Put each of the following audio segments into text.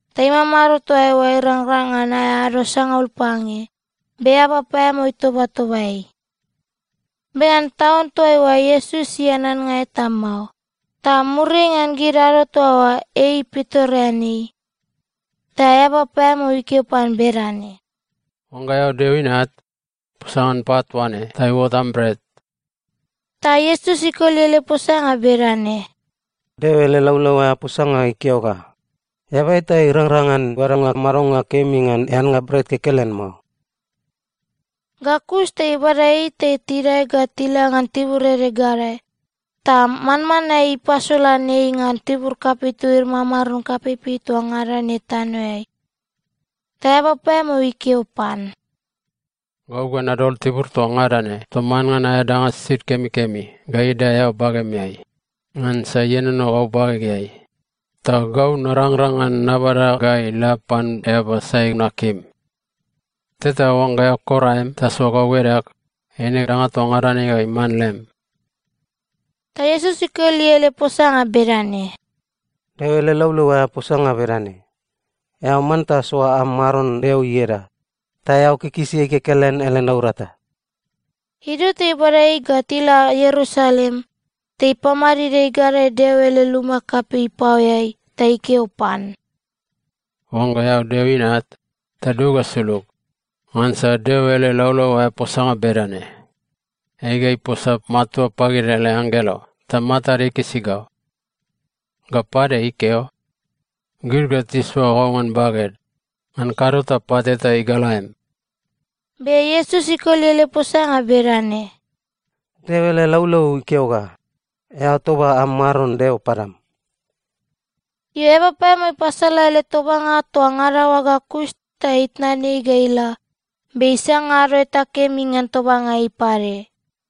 ta imamado toa eoa irangrang ngan aea ado sangaul pange, be eaba paeamao itobatoba ei. Be ngan taun toaiua Iesus ian annga eta mao, ta muriai ngan gid ado toa oa, ei pitoreanei. Ta eaba paeamao ikeo pan bedane, “Oangga eao Deo Inat, posa ngan pat toa ne ta iuot am bret.” Ta Iesus ikoli ele posanga bedane, “Deo ele laulau aea posanga ikeo ga, ‘Eaba eta irangrang ngan badanga madonga kemi ngan eannga bret kekelen mao.’” Ga kus ta ibada ei ta tidae ga tila ngan tibur ede gadae, ta manmanae ipasolan ei ngan tibur kapei togid mamaron kapeipei toa ngada ne tanoeai. Ta eaba paeamao ikeo pan, “Gau ga nadol tibur toa ngada ne toman ngan aea danga sisid kemikemi ga idae eao bagemeai. Ngansa ienono gau bagegeai, ta gau narangrang ngan nabada ga ila pan eaba sai nakim. Tota oangga eao kor aem ta soa gau edag, eine danga toa ngada ne ga iman lem.” Ta Iesus ikoli ele posanga bedane, “Deo ele laulau aea posanga bedane, ‘Eao manta soa am Maron Deo ieda, ta eao kikisi ei kekelen ele naurata.’” Idio ta ibada ei ga tila Ierusalem, ta ipamadid ei gadae Deo ele luma kapei ipaoeai ta ikeo pan, “Oangga eao Deo Inat, ta dug ga sulug. Ngansa Deo ele laulau aea posanga bedane, “‘Ei ga iposa matua pagid ele anggelo ta matad ikisi go.’ Ga pade ikeo, “‘Gid ga tisoa go ngan baged, ngan kado ta pat eta igal aem.’” Be Iesus ikoli ele posanga bedane, “Deo ele laulau ikeo ga, ‘Eao toba am Maron Deo padam.’” Io, eaba paeamao ipasala ele tobanga toa ngada oa ga kus ta itnan ei ga ila, be isanga ado eta kemi ngan tobanga ei pade.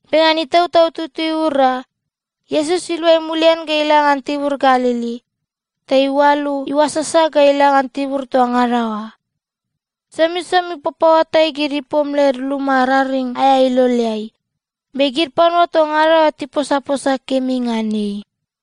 Be ngan Itautau Tutui iura, Iesus iluai mulian ga ila ngan tibur Galili. Ta iualu iuasasa ga ila ngan tibur toa ngada oa. Somisomi ipapaoatai gid ipom led luma raring aea iloleai, be gid panua toa ngada oa tiposaposa kemi ngan ei.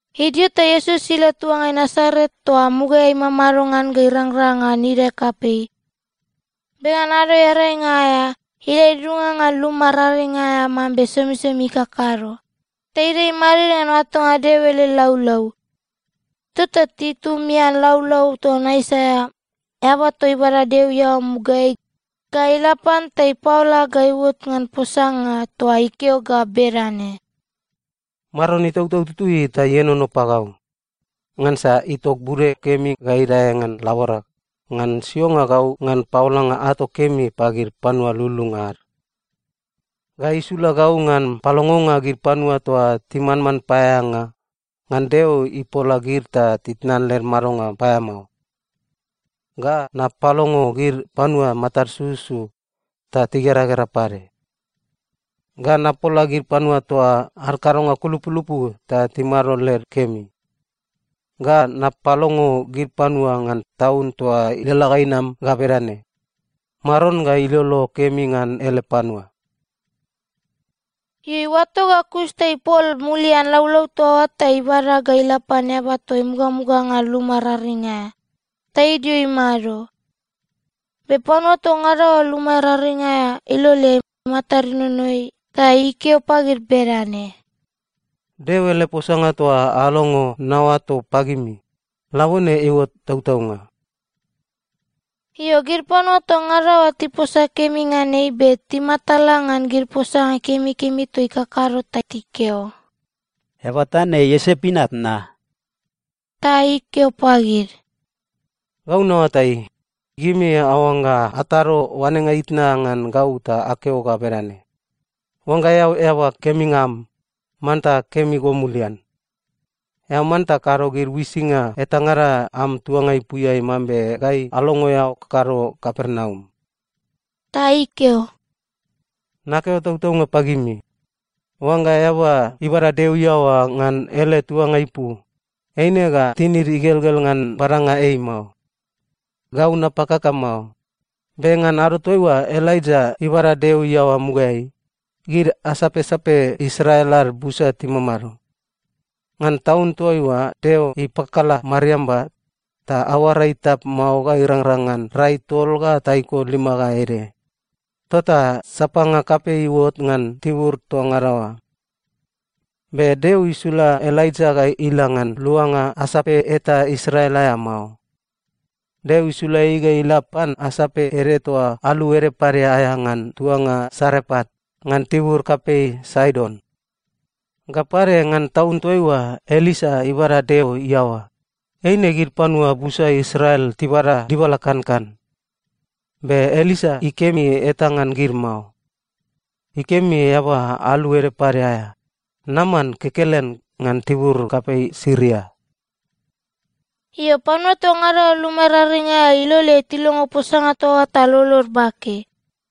Idio ta Iesus ila tuangai Nasaret toa mugaeai imamado ngan ga irangrang ngan idae kapei. Be ngan Ado Earainga aea, ila idudunga ngan luma raring aea mambe somisomi ikakado, ta idae imadid ngan oatonga Deo ele laulau. Tota titumian laulau ton Aisaia, eaba toa ibada Deo iaoa mugaeai, ga ila pan ta ipaola ga iuot ngan posanga toa ikeo ga bedane, “Maron Itautau Tutui ta ienono pagau, ngansa itok bude kemi ga idae ngan laborag ngan sionga gau ngan paolanga ato kemi pagid panua lululunga ad. Ga isula gau ngan palongonga gid panua toa timanman paeaeanga, ngan Deo ipola gid ta titnan led madonga paeamao. Ga napalongo gid panua matad sususu ta tigeragera pade. Ga napola gid panua toa ad kadonga kulupulupu ta timado led kemi. Ga napalongo gid panua ngan taun toa ilalala ga inam ga bedane: Maron ga ilolo kemi ngan ele panua.” Io, iuato ga kus ta ipol mulian laulau toa oa ta ibada ga ila pan eaba toa imugamuga ngan luma raring aea, ta idio imado. Be panua toa ngada oa luma raring aea iloleai matad inono ei. Ta ikeo pagid bedane, “Deo ele posanga toa alongo naoato pagimi, labone iuot tautaunga.” Io, gid panua toa ngada oa tiposa kemi ngan ei, be timatala ngan gid posanga kemikemi toa ikakado ta tikeo, “Eaba toa ne Iosep inat na?” Ta ikeo pagid, “Gau naoatai, gimi aoangga atado oanenga itna ngan gau ta akeo ga bedane, ‘Oangga eao eaba keminga am, manta kemi go mulian. Eao manta kado gid uisinga etangada am tuanga ipuiai mambe gai alongo eao kakado Kapernaum.’” Ta ikeo, “Nakeo tautaunga pagimi, oangga eaba ibada Deo iaoa ngan ele tuanga ipu, eine ga tinid igelgel ngan badanga ei mao. Gau napakaka mao, be ngan ado toaiua Elaija ibada Deo iaoa mugaeai, gid asapsape Israel ad busa timamado. Ngan taun toaiua Deo ipakala mariamba, ta aoara itap mao ga irangrang ngan rai tol ga taiko lima ga ede, tota sapanga kapei iuot ngan tibur toa ngada oa. Be Deo isula Elaija ga ila ngan luanga asape eta Israel aea mao. Deo isula ei ga ila pan asape ede toa alu ede pade aea ngan tuanga Sarepat ngan tibur kapei Saidon. Ga pade, ngan taun toaiua Elisa ibada Deo iaoa, eine gid panua busa Israel tibada dibala kankan. Be Elisa ikemi eta ngan gid mao. Ikemi eaba alu ede pade aea, Naman kekelen ngan tibur kapei Siria.” Io, panua toa ngada oa luma raring aea iloleai tilongo posanga toa oa ta lolod bake.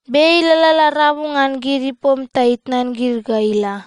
Be ei ilalala rabu ngan gid ipom ta itnan gid ga ila.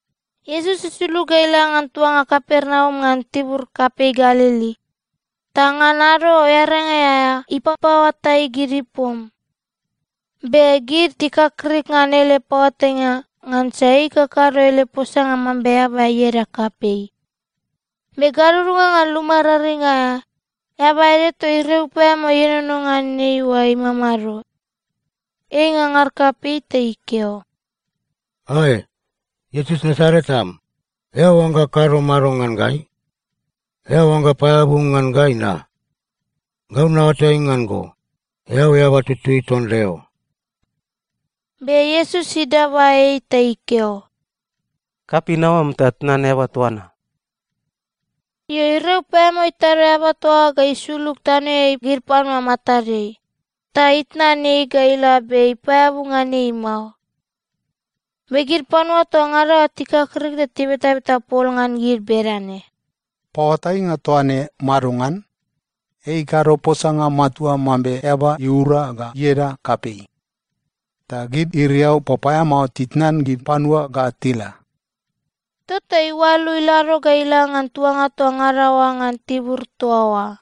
Iesus isulug ga ila ngan tuanga Kapernaum ngan tibur kapei Galili, ta ngan Ado Earainga aea ipapaoatai gid ipom. Be gid tikakrik ngan ele paoatainga, ngansa ei ikakado ele posanga mambe eaba ieda kapei. Be gadudunga ngan luma raring aea, eaba ede toa iriau paeamao ienono ngan ei oa imamado. Ei ingangar kapei ta ikeo ga, “Ae! Iesus Nasaret am, eao oangga kado mado ngan gai? Eao oangga paeabu ngan gai na? Gau naoatai ngan go. Eao Eaba Tutui ton Deo.” Be Iesus idaba ei ta ikeo, “Kapin aoam ta tnan eaba toa na.” Io, iriau paeamao itado eaba toa oa ga isulug tanoeai gid panua matadeai, ta itnan ei ga ila be ipaeabu ngan ei mao. Be gid panua toa ngada oa tikakrik ta tibetabeta pol ngan gid bedane, “Paoatainga toa ne madongan? Ei ikado posanga matua mambe eaba iura ga ieda kapei, ta gid iriau papaeamao titnan gid panua ga tila.” Tota iualu ilado ga ila ngan tuanga toa ngada oa ngan tibur toa oa.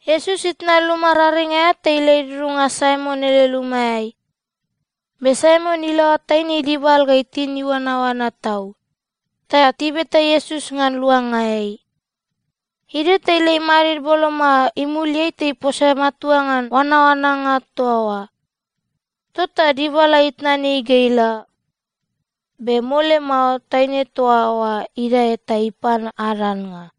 Iesus itnan luma raring aea ta ila idudunga Saimon ele lumaeai. Be Saimon ilaoa taine idibal ga itin iuanaoana tau. Ta tibeta Iesus ngan luanga ei. Idio ta ila imadid boloma imuliai ta iposa matua ngan oanaoananga toa oa. Tota dibala itnan ei ga ila. Be mole mao, taine toa oa idae ta ipan ad annga.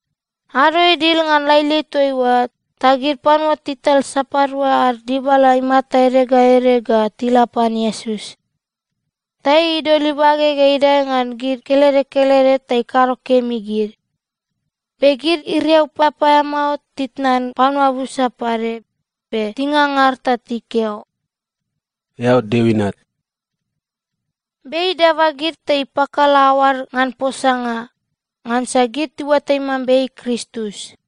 Ado idil ngan lailai toaiua, ta gid panua tital sapadua ad dibala imata ede ga ede ga tila pan Iesus. Ta ei idol ibage ga idae ngan gid kelede kelede ta ikado kemi gid. Be gid iriau papaeamao titnan panua busa pade, be tingangar ta tikeo, “Eao Deo Inat.” Be ei idaba gid ta ipakala aoad ngan posanga, ngansa gid tiuatai mambe ei Kristus.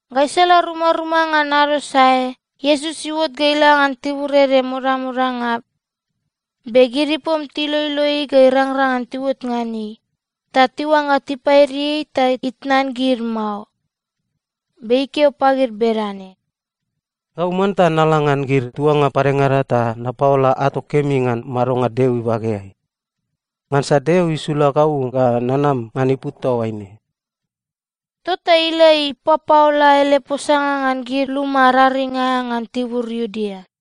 Gaisala rumaruma ngan ado sae Iesus iuot ga ila ngan tibur ede modamodanga. Be gid ipom tiloilo ei ga irangrang ngan tiuot ngan ei, ta tiuangga tipaidi ei ta itnan gid mao. Be ikeo pagid bedane, “Gau manta nala ngan gid tuanga padengada ta napaola ato kemi ngan madonga Deo ibageai. Ngansa Deo isula gau ga nanam ngan ipu toaine.” Tota ila ipapaola ele posanga ngan gid luma raring aea ngan tibur Iudea.